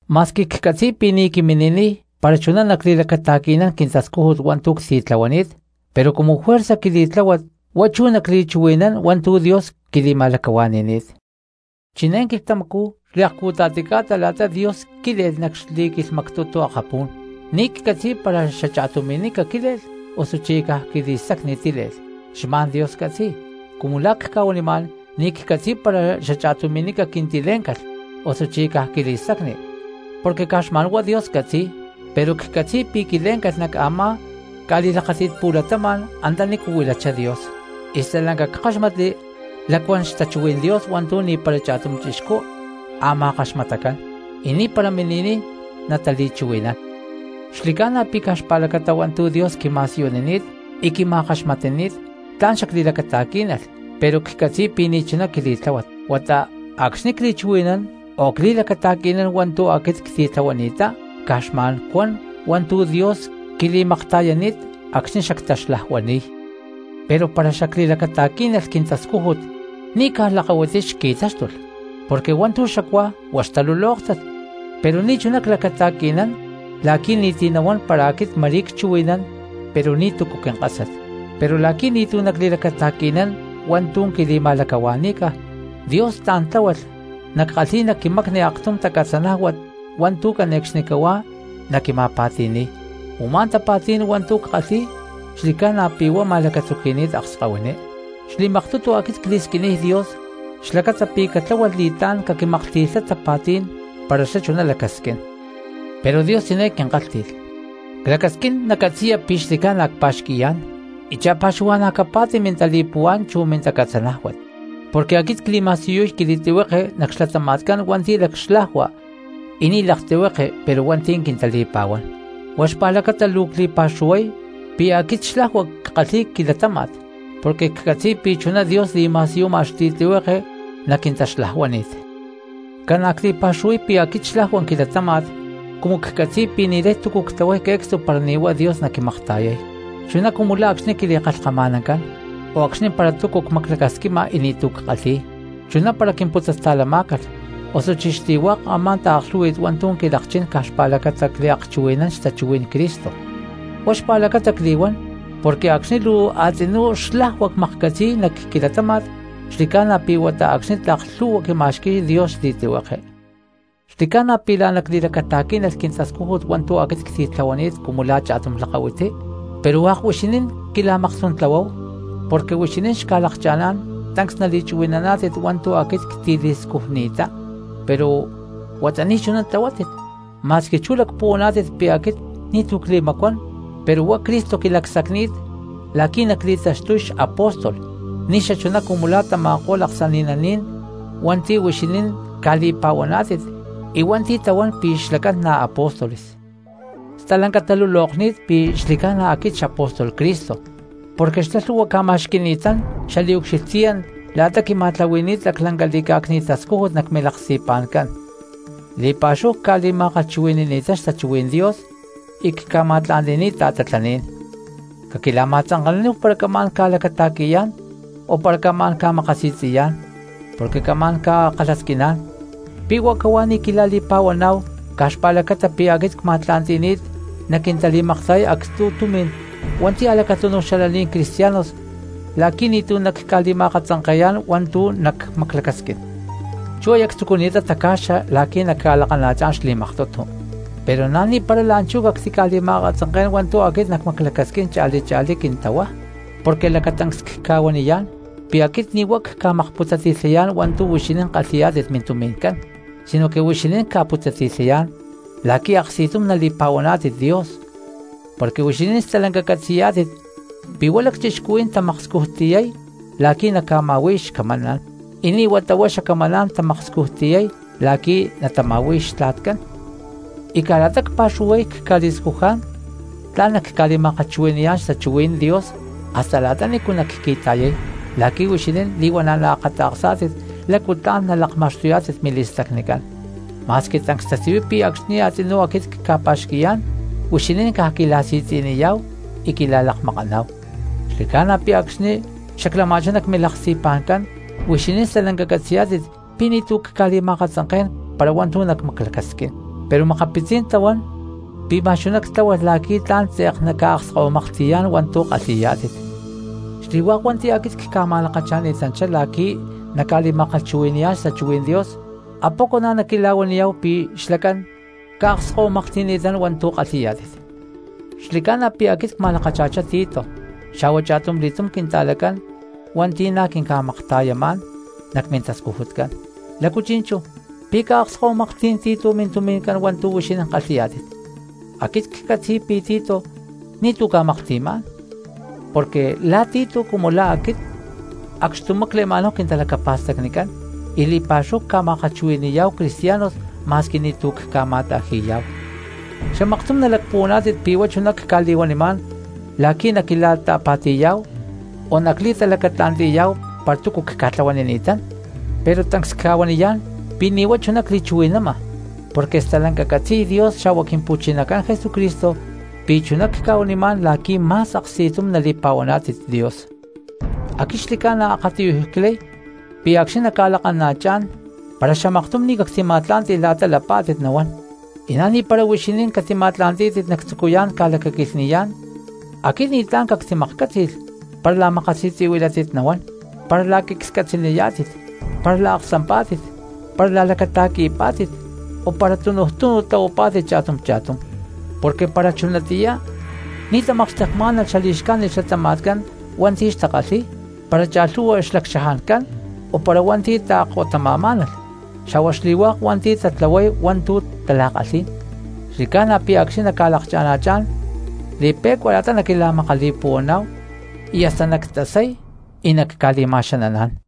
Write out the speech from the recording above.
Ma̠squi ccatzi̠y pi̠ ni̠ quimini̠niy para chuná nactili̠lacata̠qui̠nán quintascújut hua̠ntu̠ ctitlahuani̠t, pero cumu juerzaj quili̠tláhuat huá chú nacli̠chuhui̠nán hua̠ntu̠ Dios quili̠ma̠lacahuani̠ni̠t. Chiné quilhtamacú xliakcu̠ta̠ti ca̠ta la̠ta Dios quíle̠lh nac xli̠quilhmactutu akapú̠n, ni̠ ccatzi̠y para xacha̠tumi̠nica quíle̠lh osuchí caj quili̠stacni tíle̠lh, xma̠n Dios catzi̠y. Cumu la̠ cca̠huanimá̠n ni̠ ccatzi̠y para xacha̠tumi̠nica quintilé̠ncalh osuchí caj quili̠stacni, porque caj xma̠nhuá Dios catzi̠y. Pero ccatzi̠y pi̠ quilé̠ncalh nac a̠má ca̠li̠lakáti̠t pu̠latama̠n antanícu huilachá Dios, y stalanca ckáxmatli lacuán xtachuhuí̠n Dios hua̠ntu̠ ni̠para cha̠tum chixcú a̠ ma̠kaxmatacán, y ni̠para mini̠niy natali̠chuhui̠nán. Xli̠ca̠na pi̠ caj xpa̠lacata hua̠ntu̠ Dios quima̠siyunini̠t y quima̠kaxmatani̠t tla̠n xacli̠lacata̠quí̠nalh, pero ccatzi̠y pi̠ ni̠chuná quili̠tláhuat, huata acxni̠ cli̠chuhui̠nán o cli̠lacata̠qui̠nán hua̠ntu̠ aquit ctitlahuani̠ttá, caj xma̠n cuan hua̠ntu̠ Dios quili̠makta̠yani̠t acxni̠ xactaxlajuani̠y. Pero para xacli̠lacata̠quí̠nalh quintascújut ni̠ caj lakahuiti xqui̠táxtulh, porque hua̠ntu̠ xacuá huá xtalulóktat; pero ni̠chuná clacata̠qui̠nán la̠qui̠ ni̠ti̠ nahuán para aquit ma̠rí cchuhui̠nán pero ni̠tu̠cu quinka̠sat. Pero la̠qui̠ ni̠tu̠ nacli̠lacata̠qui̠nán hua̠ntu̠ quili̠ma̠lacahua̠ní̠ca Dios tla̠n tláhualh nackalhíy nac quimacni aktum tacatzanájuat hua̠ntu̠ cane̠cxnicahuá naquima̠pa̠ti̠ni̠y, u̠má tapa̠tí̠n hua̠ntu̠ ckalhi̠y xli̠ca̠na pi̠ huá ma̠lacatzuqui̠ni̠t akskahuiní. Xli̠maktutu aquit cli̠squiniy Dios xlacata pi̠ catláhualh li̠tlá̠n caquimaklhti̠lhá tapa̠tí̠n para xlá chuná lacasquín. Pero Dios chiné quinkalhti̠y: “Clacasquín nacatzi̠ya pi̠ xli̠ca̠na cpa̠xqui̠yá̠n y cha̠pa̠xuhua̠na̠ capa̠ti mintali̠puhuá̠n chu mintacatzanájuat; porque aquit cli̠ma̠siyuy quili̠tlihueke nac xlatama̠tcán hua̠nti̠ lacxlajua y ni̠ laktlihuekén, pero hua̠nti̠ quintali̠pa̠huán.” Huá xpa̠lacata luu cli̠pa̠xuhuay pi̠ aquit xlajua ckalhi̠y quilatáma̠t porque ccatzi̠y pi̠ chuná Dios li̠ma̠siyuma xli̠tlihueke nac quintaxlajuánit. Ca̠na cli̠pa̠xuhuay pi̠ aquit xlajua quilatáma̠t cumu la̠ acxni̠ ccatzi̠y pi̠ ni̠lay túcu ctlahuay que̠cstu para ni̠ huá Dios naquimakta̠yay, chuná cumu la̠ acxni̠ quili̠kalhkama̠nancán, o acxni̠ para túcu cmaclacasquima y ni̠tu̠ ckalhi̠y, chuná para quimputzasta̠lamá̠calh, osuchí xli̠hua̠k a̠má taaklhú̠hui̠t hua̠ntu̠ quilakchín caj xpa̠lacata cliakchuhui̠nán xtachuhuí̠n Cristo, huá xpa̠lacata cli̠huán porque acxni̠ luu a̠tzinú xlajua cmaklhcatzi̠y nac quilatáma̠t xli̠ca̠na pi̠ huata acxni̠ tlak lhu̠hua quima̠xqui̠y Dios xli̠tlihueke. Xli̠ca̠na pi̠ la̠ná cli̠lacata̠quí̠nalh quintascújut hua̠ntu̠ aquit ctitlahuani̠t cumu la̠ cha̠tum lakahuiti, pero hua̠k huixinín quila̠makstuntlahuáhu, porque huixinín xca̠lakcha̠ná̠n tancs nali̠chuhui̠naná̠tit hua̠ntu̠ aquit ctili̠scujni̠ttá pero huata ni̠chuná tlahuátit. Ma̠squi chú lacpuhuaná̠tit pi̠ aquit ni̠tu̠ cli̠macuán pero huá Cristo quilacsacni̠t la̠qui̠ nacli̠taxtuy xapóstol, ni̠xachuná cumu la̠ tama̠ko̠lh aksani̠naní̠n hua̠nti̠ huixinín ca̠li̠pa̠huaná̠tit y hua̠nti̠ tahuán pi̠ xlacán na̠ apóstoles. Stalanca talulokni̠t pi̠ xli̠ca̠na aquit xapóstol Cristo porque xlá lhu̠hua ca̠ma̠xqui̠ni̠tán xaliucxilhtíyat la̠ta quima̠tlahuani̠ni̠t laclanca li̠cá̠cni̠t tascújut nac milaksti̠pa̠ncán, li̠pa̠xúhu cca̠li̠ma̠kalhchuhui̠ni̠ni̠tán xtachuhuí̠n Dios y cca̠ma̠tla̠nti̠ni̠t ta̠tatlaní̠n. Caquila̠ma̠tzanke̠naníhu para camá̠n ca̠lacata̠qui̠yá̠n o para camá̠n ca̠makasi̠tzi̠yá̠n, porque camá̠n ca̠kalhasquiná̠n: ¿pi̠ huá cahuá ni̠ quila̠li̠pa̠huaná̠hu caj xpa̠lacata pi̠ aquit cma̠tla̠nti̠ni̠t naquintali̠makta̠yay actzu̠ tumi̠n hua̠nti̠ a̠lacatúnuj xalaní̠n cristianos, la̠qui̠ ni̠tu̠ nacca̠li̠ma̠akatzanke̠yá̠n hua̠ntu̠ nacmaclacasquín? Chú aya ctzucuni̠t taca̠xa la̠qui̠ nacca̠lakana̠chá̠n xli̠maktutu, pero na̠ ni̠para la̠nchú cactica̠li̠ma̠akatzanké̠n hua̠ntu̠ aquit nacmaclacasquín cha̠li cha̠lí quintahuá. Porque lacatancs cca̠huaniyá̠n pi̠ aquit ni̠ huá cca̠makputzati̠lhayá̠n hua̠ntu̠ huixinín kalhi̠yá̠tit mintumi̠ncán, sinoque huixinín cca̠putzati̠lhayá̠n la̠quí aksti̠tum nali̠pa̠huaná̠tit Dios. Porque huixinín stalanca catzi̠yá̠tit pi̠ huá lacchixcuhuí̠n tamakscujtiyay la̠qui̠ naca̠ma̠hui̠y xcamaná̠n, y ni̠ huata huá xacamaná̠n namakscujtiyay la̠qui̠ natama̠hui̠y xtla̠tcán. Y caj la̠ta cpa̠xuhuay cca̠li̠scujá̠n tla̠n nacca̠li̠ma̠kalhchuhui̠ni̠yá̠n xtachuhuí̠n Dios hasta la̠ta nícu nacqui̠ta̠yay la̠qui̠ huixinín li̠huana̠ naakata̠ksá̠tit lácu tla̠n nalakma̠xtuyá̠tit mili̠stacnicán; ma̠squi tancs tasiyuy pi̠ acxni̠ a̠tzinú aquit cca̠pa̠xqui̠yá̠n huixinín caj quila̠si̠tzi̠niyá̠hu y quila̠lakmakaná̠hu. Xli̠ca̠na pi̠ acxni̠ xaclama̠chá nac milaksti̠pa̠ncán huixinín stalanca catzi̠yá̠tit pi̠ ni̠tu̠ cca̠li̠ma̠akatzanké̠n para hua̠ntu̠ nacmaclacasquín, pero makapitzí̠n tahuán pi̠ ma̠x chuná ctláhualh la̠qui̠ tla̠n tze̠k nacca̠akskahuimaklhti̠yá̠n hua̠ntu̠ kalhi̠yá̠tit. Xli̠hua̠k hua̠nti̠ aquit cca̠ma̠lakacha̠ni̠tanchá la̠qui̠ naca̠li̠ma̠kalhchuhui̠ni̠yá̠n xtachuhuí̠n Dios, ¿apoco na̠ naquila̠huaniyá̠hu pi̠ xlacán ca̠akskahuimaklhti̠ni̠tán hua̠ntu̠ kalhi̠yá̠tit? Xli̠ca̠na pi̠ aquit cma̠lakacha̠chá Tito xa̠hua cha̠tumli̠túm quinta̠lacán hua̠nti̠ na̠ quinca̠makta̠yamá̠n nac quintascujutcán, ¿lácu chi̠nchú, pi̠ ca̠akskahuimaklhtí̠n Tito mintumi̠ncán hua̠ntu̠ huixinín kalhi̠yá̠tit? Aquit ccatzi̠y pi̠ Tito ni̠tu̠ ca̠maklhti̠má̠n, porque la̠ Tito cumu la̠ aquit acxtumá cle̠ma̠náhu quintalacapa̠stacnicán y li̠pa̠xúhu cca̠makta̠yayá̠hu cristianos ma̠squi ni̠tu̠ cca̠ma̠ta̠ji̠yá̠hu. Xamaktum nalacpuhuaná̠tit pi̠ huá chuná cca̠li̠huanimá̠n la̠qui̠ naquila̠ta̠pa̠ti̠yá̠hu o nacli̠talacatla̠nti̠yá̠hu para túcu cca̠tlahuanini̠tán. Pero tancs cca̠huaniyá̠n pi̠ ni̠ huá chuná cli̠chuhui̠nama, porque stalanca catzi̠y Dios xa̠hua Quimpu̠chinacán Jesucristo pi̠ chuná cca̠huanimá̠n la̠qui̠ ma̠s aksti̠tum nali̠pa̠huaná̠tit Dios. Aquit xli̠ca̠na akatiyuj clay pi̠ acxni̠ nacca̠lakana̠chá̠n para xamaktum ni̠ cactima̠tlá̠nti̠lh la̠ta lapá̠tit nahuán, y na̠ ni̠para huixinín catima̠tla̠ntí̠tit nactzucuyá̠n ca̠lacaquilhni̠yá̠n. Aquit ni̠tlá̠n cactimaklhcátzi̠lh para la̠makasi̠tzi̠huilátit nahuán, para la̠qui̠ la̠quiclhcatzaniyá̠tit, para la̠aksampá̠tit, para la̠lacata̠qui̠pá̠tit, o para tunuj túnu tlahuapá̠tit cha̠tum cha̠tum. Porque para chunatiyá ni̠ tamakxtekmá̠nalh xali̠xcájnit xlatama̠tcán hua̠nti̠ xtakalhi̠y, para cha̠lhu̠hua xlacchajancán o para hua̠nti̠ taakkottama̠má̠nalh xa̠hua xli̠hua̠k hua̠nti̠ tatlahuay hua̠ntu̠ tala̠kalhí̠n, xli̠ca̠na pi̠ acxni̠ nacca̠lakana̠chá̠n li̠pi̠cua la̠ta naquila̠makali̠puhuaná̠hu, y hasta nactasay y nacca̠li̠ma̠xananá̠n.